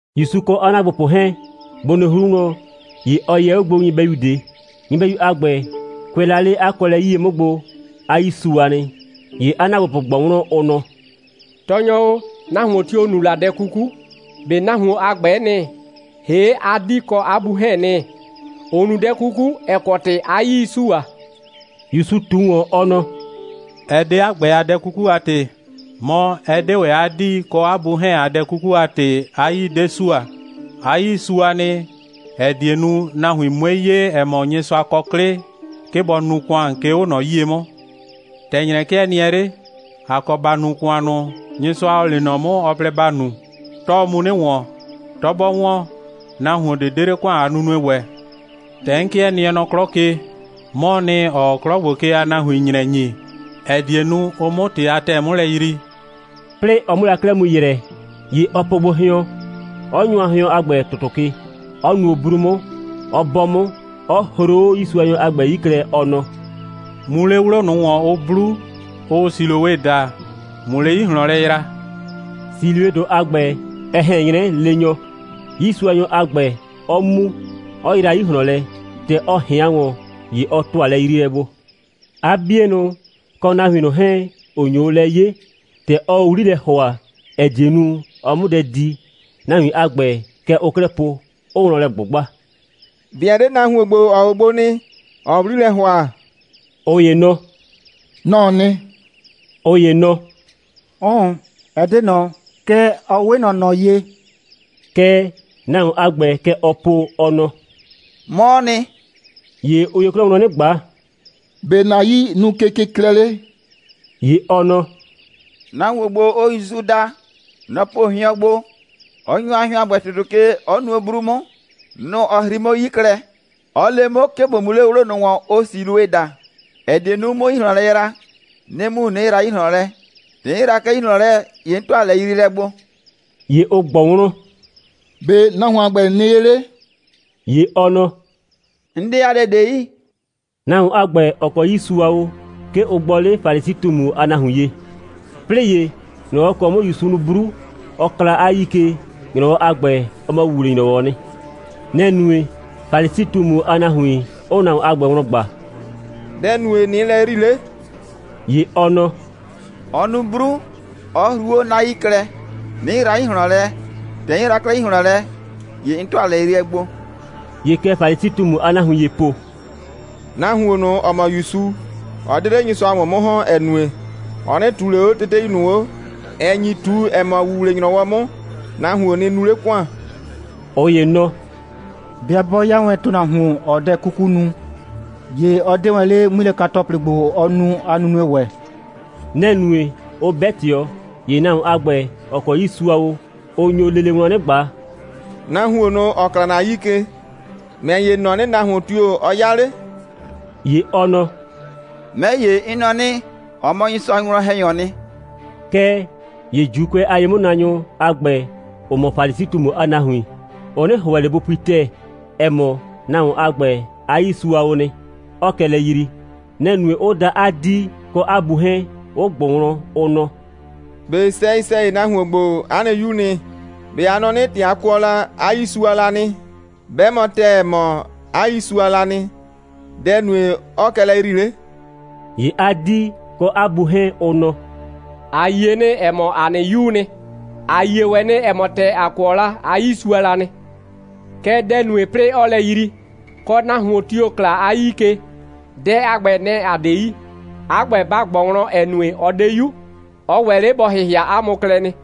‑Yusu kɔ 'a ‑naagbopʋ 'hɛɛn, bʋ nɩ 'hru wlɔn, ‑ye ɔ yɛ 'o gbo nyɩbɛyu ꞊de. Nyɩbɛyu a ‑gbɛ, kʋɛ la 'le 'a kɔɔlɛ 'yie 'mʋ gbo, 'a 'yii sua nɩ. ‑Ye 'a ‑naagbopʋ ꞊gbɔ wlɔn, ʋ nɔ: «Tɔɔnyɔ o, nahuon tio‑ nu la dɛ 'kuku? ꞊Be nahuon a ‑gbɛɛ nɩ, ‑hee' 'a 'dii kɔ 'a bu 'hɛɛn‑ nɩ, ‑ʋ nu dɛ 'kuku, ‑ɛ kɔ ‑tɩ 'a 'yii 'ɩ sua?» ‑Yusu ꞊tu ‑wɔn, ɔ nɔ: «Ɛ 'de 'a ‑gbɛ a dɛ 'kuku a ‑tɩ, mɔ, ɛ 'de ‑wɛ 'a 'dii kɔ 'a bu 'hɛɛn a dɛ 'kuku a ‑tɩ, 'a 'yii 'de sua. 'A 'yii sua nɩ, ‑ɛ die nu, nahuin 'mue 'ye, ‑ɛ mɔ, Nyɩsʋa kɔ 'klɩ, 'ke bɔ nu ‑kʋan, 'ke 'o ꞊nɔ 'yie 'mʋ. ‑Tɛ ‑nyrɛ 'kɩɛ nɩɛ 'le, ‑a kɔ ‑ba nu ‑kʋan ꞊nʋ, Nyɩsʋa, ‑ɔ lee nɔ 'mʋ, ɔ plɛ ‑ba nu. 'Tɔɔ mu 'nɩ ‑wɔn. 'Tɔ 'bɔ ‑wɔn, nahuon ꞊de 'de 'le ‑kʋan a nunue ‑wɛ. ‑Tɛ 'n 'kɩɛ nɩɛ nɔ 'klɔ ke, 'mɔɔ nɩ, ‑ɔɔ 'klɔ ‑gbo ke a nahuin ‑nyrɛ ‑nyi. ‑ɛ die nu, ʋ 'mʋ ‑tɩ a ‑tɛɛ 'mʋ lɛ yrii.» 'Plɩɩ ɔ 'mʋ la 'klɛɛ mu ‑yrɛ, ‑ye ɔ po gbo hɩɔn, 'ɔ nyʋa hɩɔn a ‑gbɛ ‑tʋtʋ ke, 'ɔ nuo 'bru 'mʋ, 'ɔ 'bɔ 'mʋ, 'ɔ hruu 'o 'yiisuanyɔ a ‑gbɛ a 'yii klɛ, ɔ nɔ: «Mu 'le 'wlo ꞊nʋ ‑wɔn, ʋ 'blu, ʋʋ Siloe daa, ꞊mʋ 'le 'yi ꞊hlɔn lɛ yra.» Siloedʋ a ‑gbɛ, ɛ ꞊hɛn 'nyrɛ leenyɔ; 'yiisuanyɔ a ‑gbɛ 'ɔ mu, 'ɔ yra 'yi ꞊hlɔn lɛ. ‑Tɛ ɔ ꞊hɩan ‑wɔn, ‑ye ɔ ‑tʋa lɛyriilɛ gbo. 'A 'bienʋ, kɔ nahuin ꞊nʋ 'hɛɛn, ‑ʋ nyo o lɛ 'ye, ‑tɛ ɔɔ o 'wli lɛ ‑hʋa, ‑ɛ die nu, ɔ 'mʋ dɛ di, nahuin a ‑gbɛ, kɛ ʋʋ 'klɛɛ po, 'ʋʋ wlɔn lɛ ꞊gbʋgba: «꞊Be ɛ 'de nahuon ‑gbo, ‑ɔɔ o gbo nɩ, ‑ɔɔ o 'wli lɛ ‑hʋa?» ꞊Ʋ ‑ye nɔ: «Nɔ‑ɔ nɩ.» ꞊Ʋ ‑ye nɔ: «'Ʋʋn, ɛ 'de ꞊nɔ, kɛɛ, ɔ 'we ꞊nɔ ꞊nɔ ye.» Kɛɛ, nahuon a ‑gbɛ, kɛ ɔɔ po, ɔ nɔ: «'Mɔɔ nɩ.» ‑Ye ʋ nyo 'klɛɛ wlɔn 'nɩ ꞊gba: «‑Be' ‑na 'yii nu kekɩklɛ 'le?» ‑Ye ɔ nɔ: «Nahuon ‑gbo, ʋʋ ‑Yusu daa, nɔ‑ po hɩɔn gbo, 'ɔ nyʋa hɩɔn a ‑gbɛ ‑tʋtʋ ke, 'ɔ nuo 'bru 'mʋ. Nʋ‑ ɔ hrii 'mʋ 'yi klɛ, 'ɔ le 'mʋ, 'ke ꞊bo mu 'le 'wlo ꞊nʋ ‑wɔn, ʋʋ Siloe daa, ‑ɛ die nu, 'mʋ 'yi ꞊hlɔn lɛ yra, 'nɩ mu, 'nɩ yra 'yi ꞊hlɔn lɛ. ‑Tɛ 'n yra 'klɛɛ 'yi ꞊hlɔn lɛ, ‑ye 'n ‑tʋa lɛyriilɛ gbo.» ‑Ye ʋ ꞊gbɔ wlɔn: «‑Be' nahuon a ‑gbɛ nɩ ye 'le?» ‑Ye ɔ nɔ: «'N 'de 'a dɛ ꞊de yi.» Nahuon a ‑gbɛ, ‑ɔ kɔ 'yii sua o, 'ke ʋ gbɔ 'le Falisi꞊tumu a nahuin ye. 'Plɩɩ ‑ye, ‑nyrɔwɔ ‑kɔ 'mʋ ‑Yusu nu 'bru, 'ɔ kla 'a 'yii ke, ‑nyrɔwɔ a ‑gbɛ, ɔ mɔ ‑wuwle‑nyrɔwɔ'ɔ nɩ. Nɛ‑ nue, Falisi꞊tumu a nahuin 'ʋʋ nahuon a ‑gbɛ wlɔn ꞊gba: «Dɛ‑ nue, ꞊nɩɩ lɛ yrii 'le?» ‑Ye ɔ nɔ: «Ɔ nu 'bru, 'ɔ hruu 'o 'na 'yii klɛ, 'nɩ yra 'yi ꞊hlɔn lɛ. ‑Tɛ 'n yra 'klɛɛ 'yi ꞊hlɔn lɛ, ‑ye 'n ‑tʋa lɛyriilɛ gbo.» ‑Ye kɛ Falisi꞊tumu a nahuin ‑yee po: «Nahuon ꞊nʋ, ‑ɔ mɔ ‑Yusu, ɔ 'de 'le Nyɩsʋa ‑wɔn 'mʋ ‑hɔn, ‑ɛ nue, ɔ 'nɩ ꞊tuu ꞊le 'o tete ꞊nʋ 'o, ‑ɛ nyi ꞊tu, ‑ɛ mɔ, ‑wuwle‑nyrɔwɔ 'mʋ, nahuon nɩ nu 'le ‑kʋan.» ꞊Ʋ ‑ye nɔ: «'Bɩa 'bɔ 'ya wɛn ‑tʋnahuon, ‑ɔɔ dɛ 'kuku nu, ‑ye ɔ 'de wɛn 'le 'ŋmilɛka‑tɔplɩ ‑gbo, ɔɔ nu a nunue ‑wɛ.» Nɛ‑ nue, 'ʋ 'bɛ ꞊tɩɔ. ‑Ye nahuon a ‑gbɛ, ‑ɔ kɔ 'yii sua o, ʋ nyo lele wlɔn 'nɩ ꞊gba: «Nahuon ꞊nʋ, ‑ɔ kla ‑na 'yii ke, ‑mɛ ‑ye, ‑n nɔ 'nɩ, nahuon tio‑ ɔ 'ya 'le?» ‑Ye ɔ nɔ: «'Mɛ ‑ye, 'n nɔ 'nɩ, ɔ mɔ Nyɩsʋa a winwlɔn‑hɛnyɔɔ nɩ.» Kɛɛ ‑ye ‑Juukʋɛ a ye'mʋnaanyʋ a ‑gbɛ, ‑ʋ mɔ Falisi꞊tumu a nahuin, ʋ 'nɩ ‑hʋɛ ꞊le bʋ pui ‑tɛɛ, ‑ɛ mɔ, nahuon a ‑gbɛ a 'yii sua o nɩ, 'ɔɔ kɛ lɛ yrii. Nɛ‑ nue, 'ʋ da 'a 'dii kɔ 'a bu 'hɛɛn, 'ʋ ꞊gbʋ wlɔn, ʋ nɔ: «꞊Be sɛyɩ‑sɛyɩ, nahuon ‑gbo, 'a nɩ 'yuu nɩ? ꞊Be a nɔ 'nɩ, ‑tɛ a kʋɔ la, 'a 'yii sua la nɩ? 'Bɛ mɔ ‑tɛɛ, ‑ɛ mɔ, 'a 'yii sua la nɩ, dɛ‑ nue, 'ɔɔ kɛ lɛ yrii 'le?» ‑Ye 'a 'dii kɔ 'a bu 'hɛɛn, ʋ nɔ: «‑A yie nɩ, ‑ɛ mɔ, ‑a nɩ 'yuu nɩ. ‑A yie ‑wɛ nɩ, ‑ɛ mɔ, ‑tɛ ‑a kʋɔ la, 'a 'yii sua la nɩ. Kɛɛ, dɛ‑ nue, 'plɩɩ 'ɔɔ lɛ yrii, kɔ, nahuon tio‑ kla 'a 'yii ke, dɛ a ‑gbɛ, nɛ‑ ‑a 'de yi. 'A ‑gbɛ, ba ꞊gbɔ wlɔn, ‑ɛ nue, ɔ 'de 'yu. Ɔ ‑wɛ 'le bɔ ‑hɩhɩa 'a mʋ klɛ nɩ.»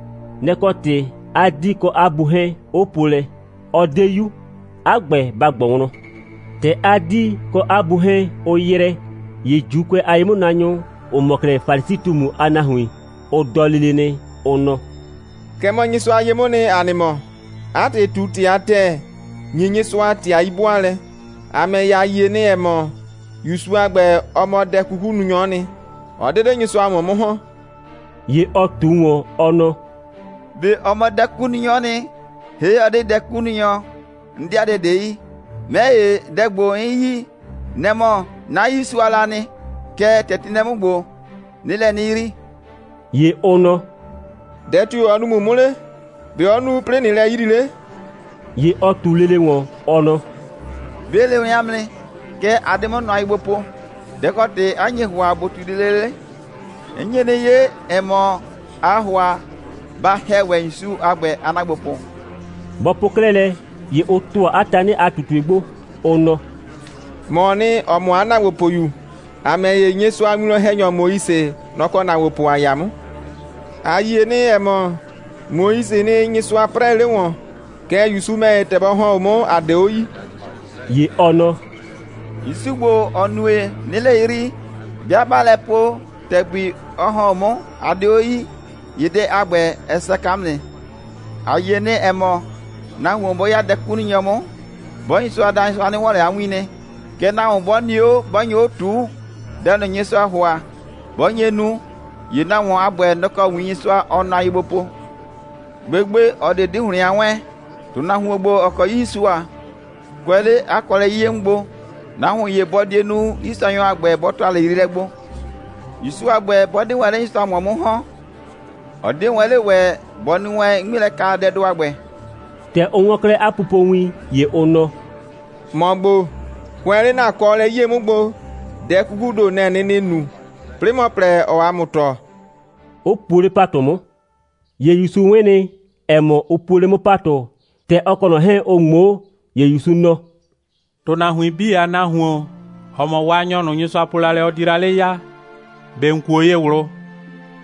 Nɛ‑ kɔ ‑tɩ 'a 'dii kɔ 'a bu 'hɛɛn, 'ʋ po lɛ: «Ɔ 'de 'yu. 'A ‑gbɛ, ba ꞊gbɔ wlɔn.» ‑Tɛ 'a 'dii kɔ 'a bu 'hɛɛn, ʋ ‑yrɛ, ‑ye ‑Juukʋɛ a ye'mʋnaanyʋ, ‑ʋ mɔ 'klɛɛ Falisi꞊tumu a nahuin, ʋ dɔ lele nɩ, ʋ nɔ: «Kɛ mɔ Nyɩsʋa ye 'mʋʋ nɩ, ‑a nɩ mɔ. 'A ‑tɩ, ꞊tu ‑tɩ a ‑tɛɛ, ‑nyi Nyɩsʋa ‑tɩ a 'yi'bʋaalɛ. ‑A ‑mɛ ‑ye, ‑a yie nɩ, ‑ɛ mɔ, ‑Yusu a ‑gbɛ, ɔ mɔ dɛ'kukununyɔ'ɔ nɩ. Ɔ 'de 'le Nyɩsʋa ‑wɔn 'mʋ ‑hɔn.» ‑Ye ɔ ꞊tu ‑wɔn, ɔ nɔ: «꞊Be ɔ mɔ dɛ'kukununyɔ'ɔ nɩ, ‑hee' ɔ 'de dɛ'kukununyɔ, 'n 'de 'a dɛ ꞊de yi. 'Mɛ ‑ye, dɛ ‑gbo, 'n yi, nɛ‑ mɔ, 'na 'yii sua la nɩ, kɛɛ, ‑tɛ ti nɩ lɛ 'mʋ ‑gbo, 'nɩɩ lɛ 'nɩ yrii.» ‑Ye ʋ nɔ: «Dɛ tio‑ ɔ nu ‑mʋ 'mʋ 'le? ‑Be' ɔ nu, 'plɩɩ ꞊nɩɩ lɛ yrii 'le?» ‑Ye ɔ ꞊tu lele ‑wɔn, ɔ nɔ: «'Be 'n le wɛn 'a mʋ nɩ. Kɛɛ, a 'de 'mʋ nʋa ye gbo po. Dɛ‑ kɔ ‑tɩ 'a nye ‑hʋa, ꞊bo ꞊tui lele 'le? 'N nye 'nɩ 'ye, ‑ɛ mɔ, aa ‑hʋa ba ‑hɛ ‑wɛ ‑Yusu a ‑gbɛ a ‑naagbopʋ.» Bɔ po 'klɛɛ lɛ, ‑ye ʋ ‑tʋa 'a tanɩ a ꞊tutue gbo, ʋ nɔ: «‑Mɔɔ nɩ, ‑ɔ mɔ 'a ‑naagbopʋyu. ‑A ‑mɛ ‑ye, Nyɩsʋa a winwlɔn‑hɛnyɔ Moise, nɔ‑ kɔ ‑naagbopʋ ‑a 'ya 'mʋ. ‑A yie nɩ, ‑ɛ mɔ, Moisee nɩ, Nyɩsʋa 'prɛɛ 'le ‑wɔn. Kɛɛ, ‑Yusu ‑mɛ ‑ye, ‑tɛ bɔ ‑hɔn 'o 'mʋ, ‑a 'de 'o yii.» ‑Ye ɔ nɔ: «‑Yusu ‑gbo, ‑ɔ nue, 'nɩɩ lɛ yrii, 'bɩa 'baa lɛ po, ‑tɛgbi ɔ ‑hɔn 'o 'mʋ, a 'de 'o yii, ‑ye dɛ a ‑gbɛ, ɛ saka 'mʋ nɩ. ‑A yie nɩ, ‑ɛ mɔ, nahuon 'bɔ 'ya dɛ'kukununyɔ 'mʋ, 'bɔɔ Nyɩsʋa da, Nyɩsʋa 'nɩ 'wɔn ꞊le 'a win nɩ. Kɛɛ, nahuon 'bɔ nɩ 'o, 'bɔ nyo 'o ꞊tuu, dɛ ꞊nʋ, Nyɩsʋaa ‑hʋa, 'bɔ nye nu, ‑ye nahuon a ‑gbɛ, nɔ‑ kɔ win Nyɩsʋa, ɔɔ nʋa ye gbo po. Gbegbe, ꞊ɔ ꞊de 'di ‑hlɩn a 'wɛɛn, ‑tʋnahuon ‑gbo, ‑ɔ kɔ 'yii sua, kʋɛ 'le 'a kɔɔlɛ 'yie 'mʋ gbo, nahuon ‑ye bɔ die nu, 'yiisuanyɔ a ‑gbɛ bɔ ‑tʋa lɛyriilɛ gbo. ‑Yusu a ‑gbɛ 'bɔ 'de wɛn 'le Nyɩsʋa ‑wɔn 'mʋ ‑hɔn, ɔ 'die wɛn 'le ‑wɛ, bɔ nu wɛn 'ŋmilɛkadɛdʋ a ‑gbɛ.» ‑Tɛ ʋ 'wɔn 'klɛɛ 'a pupowin, ‑ye ʋ nɔ: «‑Mɔ ‑gbo, kʋɛ 'le ‑na kɔɔlɛ 'yie 'mʋ gbo, dɛ 'kukuu ‑do, nɛ‑ ‑nɩɩ nu, 'plɩɩ ‑mɔ plɛ, ‑ɔɔ ‑a mʋ tɔɔ,» 'ʋ puo 'le ‑patʋ 'mʋ. ‑Ye ‑Yusu 'wɩn nɩ, ‑ɛ mɔ, ʋ puo 'le 'mʋ ‑patʋ. ‑Tɛ ɔ kɔ ꞊nɔ 'hɛɛn, ʋ ꞊ŋmoo, ‑ye ‑Yusu nɔ: «‑Tʋnahuin 'bii a Nahuon, ‑ɔ mɔ Waanyɔ ꞊nʋ, Nyɩsʋa po la lɛ, ɔ di la 'le ya, ꞊be ‑n kuo ye ꞊wlʋ?»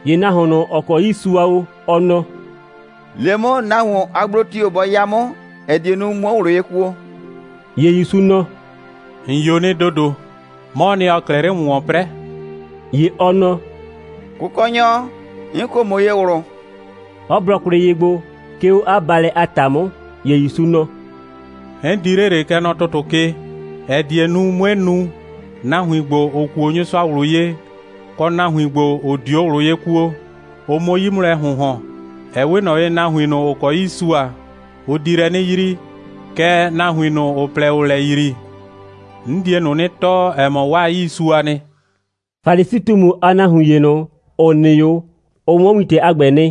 ‑Ye nahuon ꞊nʋ, ‑ɔ kɔ 'yii sua o, ɔ nɔ: «Le 'mʋ, nahuon a gblo tio‑ bɔ 'ya 'mʋ, ‑ɛ die nu, 'muo ꞊wlʋ ye kuo.» ‑Ye ‑Yusu nɔ: «‑N 'yo nɩ ‑dodo. 'Mɔɔ nɩ, ‑ɔɔ 'klɛɛ 'le ‑mʋ ‑wɔn 'prɛɛ.» ‑Ye ɔ nɔ: «Kʋkɔnyɔ, 'n kuo ‑mʋ ye ꞊wlʋ,» 'ɔ blɔ kwlɩ ye gbo, 'ke 'o 'a baalɛ a ‑ta 'mʋ. ‑Ye ‑Yusu nɔ: «'N di 'le ꞊le, kɛ nɔ ‑tʋtʋ ke, ‑ɛ die nu, 'mue nu, nahuin ‑gbo, ‑ʋ kuo Nyɩsʋa ꞊wlʋ ye, kɔ nahuin ‑gbo, ‑ʋ 'dio ꞊wlʋ ye kuo, ʋ 'mʋ 'yi 'mʋ lɛ ‑hʋnhɔn. Ɛ 'we ꞊nɔ ye, nahuin ꞊nʋ, ‑ʋ kɔ 'yii sua, ʋ di lɛ 'nɩ yrii, kɛɛ, nahuin ꞊nʋ, ‑ʋ plɛ, ‑ʋʋ lɛ yrii, 'n die ꞊nʋ 'nɩ tɔɔ, ‑ɛ mɔ, 'waa 'yii sua nɩ.» Falisi꞊tumu a nahuin ‑ye ꞊nʋ, ‑ʋ nɩ 'o, ʋ 'wɔn wintɛ a ‑gbɛ nɩ.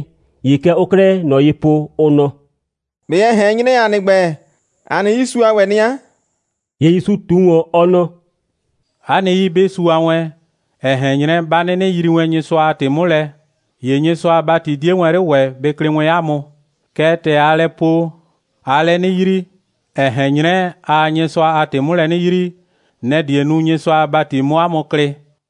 ‑Ye kɛ ʋʋ 'klɛɛ ꞊nɔ ye po, ʋ nɔ: «꞊Be ɛ ꞊hɛn 'nyrɛ, ‑a nɩ ‑gbɛ, ‑a nɩ 'yii sua ‑wɛ nɩ 'a?» ‑Ye ‑Yusu ꞊tu ‑wɔn, ɔ nɔ: «'A nɩ 'yii, 'bɩ sua wɛn, ‑ɛ ꞊hɛn 'nyrɛ, 'ba 'nɩnɩ yrii wɛn Nyɩsʋa a ‑tɩ 'mʋ lɛ, ‑ye Nyɩsʋa a ‑bati 'die wɛn 'le ‑wɛ bɩ klɩ wɛn 'a mʋ. Kɛɛ, ‑tɛ aa lɛ po, aa lɛ 'nɩ yrii, ‑ɛ ꞊hɛn 'nyrɛ, aa Nyɩsʋa a ‑tɩ 'mʋ lɛ 'nɩ yrii, nɛ‑ die nu, Nyɩsʋa a ‑bati 'mʋ 'a mʋ klɩ.»